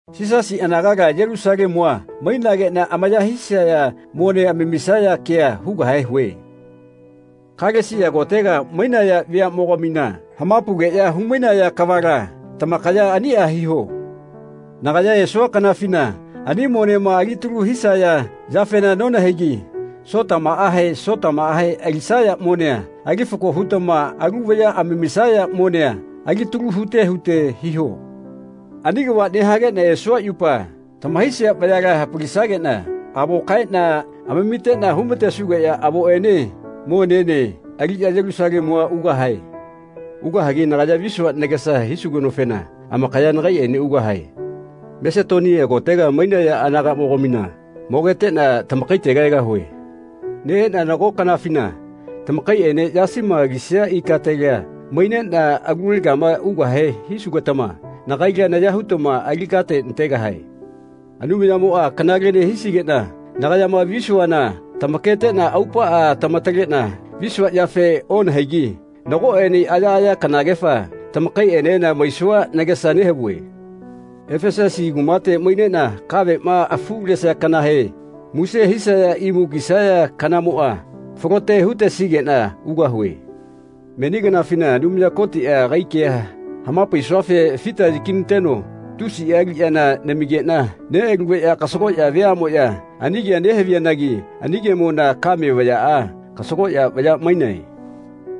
Yisasi anagala Yelusalemua mainageꞌna amaya hisaya mone amamisaya kea hugahe hue. Kalesia kotega mainaya veaꞌmogamina hamapaugeꞌya humainaya kavala tamakaya aniꞌa hiho. Nagaya esua kanafina ani monema alitalu hisaya yafena nonahaigi Sotamaꞌahe Sotamaꞌahe alisaya monea ali fako hutama alu vaya amamisaya monea alitalu hute hute hiho. Ani kava nehageꞌna esua yupa tamahaisia vayala hapalisageꞌna avo kaeꞌna amamiteꞌna humatesugeꞌya avoꞌene monene aliꞌya Yelusalemua ugahae. Ugahagi nagaya visua nagesa hisugenofena amakaya nagaiꞌene ugahae. Masetonia kotega mainaya anagaꞌmogamina mogeteꞌna tamakaitega egahue. Neꞌeꞌna nago kanafina tamakaiꞌene yasima alisia ikatela maineꞌna alulegama ugahe hisugetama nagaila naya hutama ali kate nategahae. Anumayamoꞌa kanalene hisigeꞌna nagayama visuana tamaketeꞌna aupaꞌa tamataleꞌna visua yafe onahaigi nagoꞌene ayaꞌaya kanagefa tamakaiꞌenena maisua nagesa nehavue. Efesusi kumate maineꞌna kaveꞌma afulesia kanahe muse hisaya imu kisaya kanamoꞌa falote hutesigeꞌna ugahue. Meni kanafina Anumaya Kotiꞌa agai kea hamapaisuafe fita yakinateno tusiꞌa aliꞌyana namigeꞌna neꞌalugeꞌya kasagoꞌya veaꞌmoꞌya ani kea nehaviyanagi ani kemona kame vayaꞌa kasagoꞌya vaya mainae.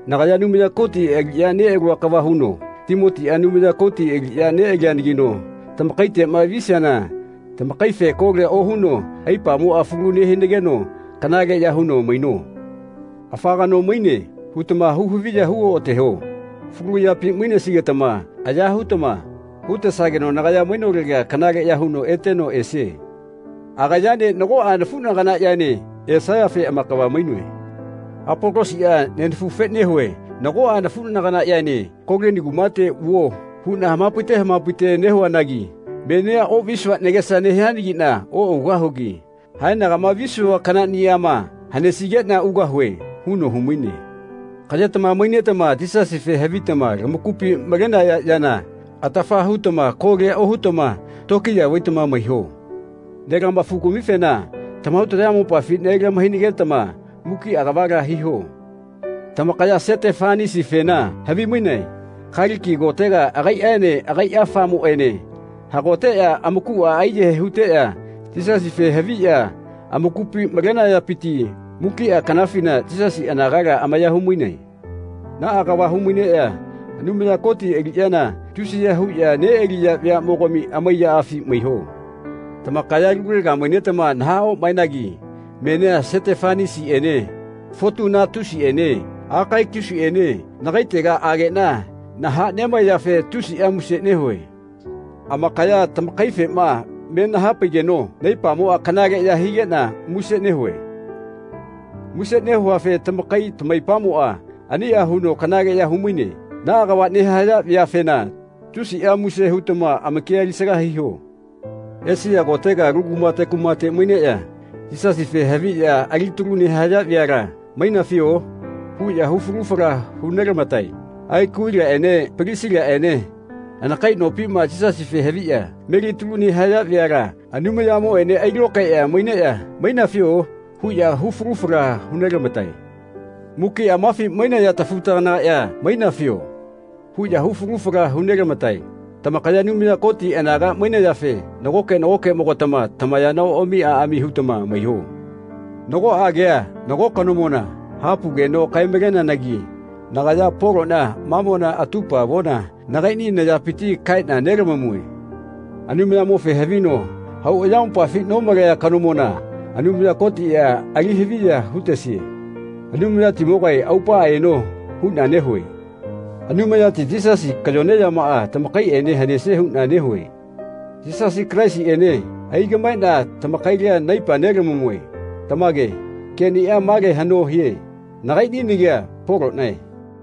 Nagaya Anumaya Koti aliꞌya neꞌalua kava huno Timotiꞌa Anumaya Koti aliꞌya neꞌalianagino tamakaiteꞌma visiana tamakaife kolia ohuno aipamoꞌa falu nehinageno kanaleꞌya huno maino. “Afa kano maine.” hutama hu-haviya hu-oꞌateho. Falu yapi mainesigetama aya hutama hutesageno nagaya mainolega kanaleꞌya huno eteno esie. Agayaene nagoꞌa nafuꞌnaganaꞌyaene esayafe amakava mainoe. Apolosiꞌa nenafufe nehue nagoꞌa nafuꞌnaganaꞌyaene “Kolini kumate vuo” huꞌna hamapaite hamapaite nehuanagi “Menia oꞌvisua nagesa nehianagiꞌna oꞌugahugi haenagama visua kanaꞌniꞌama hanesigeꞌna ugahue.” huno humaine. Kaꞌyetama mainetama Yisasife havitama lamakupi malenaya yana atafa hutama kolia ohutama lokiya vaitama maiho. Nelama-fugamifena tamahau tamayamopafi nelahainage-tama mukiꞌa kavala hiho. Tamakaya Setefanasifena havi-mainae. Kaliki kotega agaiꞌene agaiꞌa afamoꞌaene hagoteꞌya amakuꞌa aiyahae huteꞌya Yisasife haviꞌya amakupi malenayapiti mukiꞌa kanafina Yisasi anagala amaya humainae. Naꞌa kava humaineꞌya Anumaya Koti aliꞌyana tusiya huꞌya neꞌaliya veaꞌmogami amaiyaꞌafi maiho. Tamakaya alulega mainetama nahaꞌomaenayanagi menia Setefanasiꞌene Fotunatusiꞌene Akaikusiꞌene nagaitega ageꞌna nahaꞌnemaeyafe tusiꞌa muse nehue. Amakaya tamakaifema me nahapaigeno naipamoꞌa kanaleꞌya higeꞌna muse nehue. Muse nehuafe tamakai tamaipamoꞌa aniꞌa huno kanaleꞌya humaine. Naꞌa kava nehaya vayafena tusiꞌa muse hutama amakia alisaga hiho. Esia kotega alu kumate kumate maineꞌya Yisasife haviꞌya alitalu nehaya veala “Mainafio?” huꞌya hu falu fala hunelamatae. Akuvilaꞌene Palisilaꞌene anakai nopima Yisasife haviꞌya melitalu nehaya veala Anumayamoꞌene ailokaeꞌya maineꞌya “Mainafio?” huꞌya hu falu fala hu nelamatae. Mukiꞌa mafi mainaya tafu-taganagaꞌya “Mainafio.” huꞌya hu falu fala hu nelamatae. Tamakaya Anumaya Koti anaga mainayafe nagoke nagokeꞌmogatama tamayana oꞌami aꞌami hutama maiho. Nagoꞌa kea nago kanomona hapaugeno kae-maleneanagi nagaya Poloꞌna mamona atupa avona nagaiꞌni nayapiti kaeꞌna nelamamue. Anumayamofe havino hau ayamopafi nomalea kanomona Anumaya Kotiꞌa ali haviya hutesie. “Anumayatimogae aupaꞌa eno.” huꞌna nehue. Anumayati Yisasi kayone yamaꞌa tamakaiꞌene hanesie huꞌna nehue. Yisasi Kalaisiꞌene aigaꞌmaeꞌna tamakaila naipa nelamamue. Tamage. Keꞌnia male haꞌno hie. Nagaiꞌni nagia Poloꞌnae.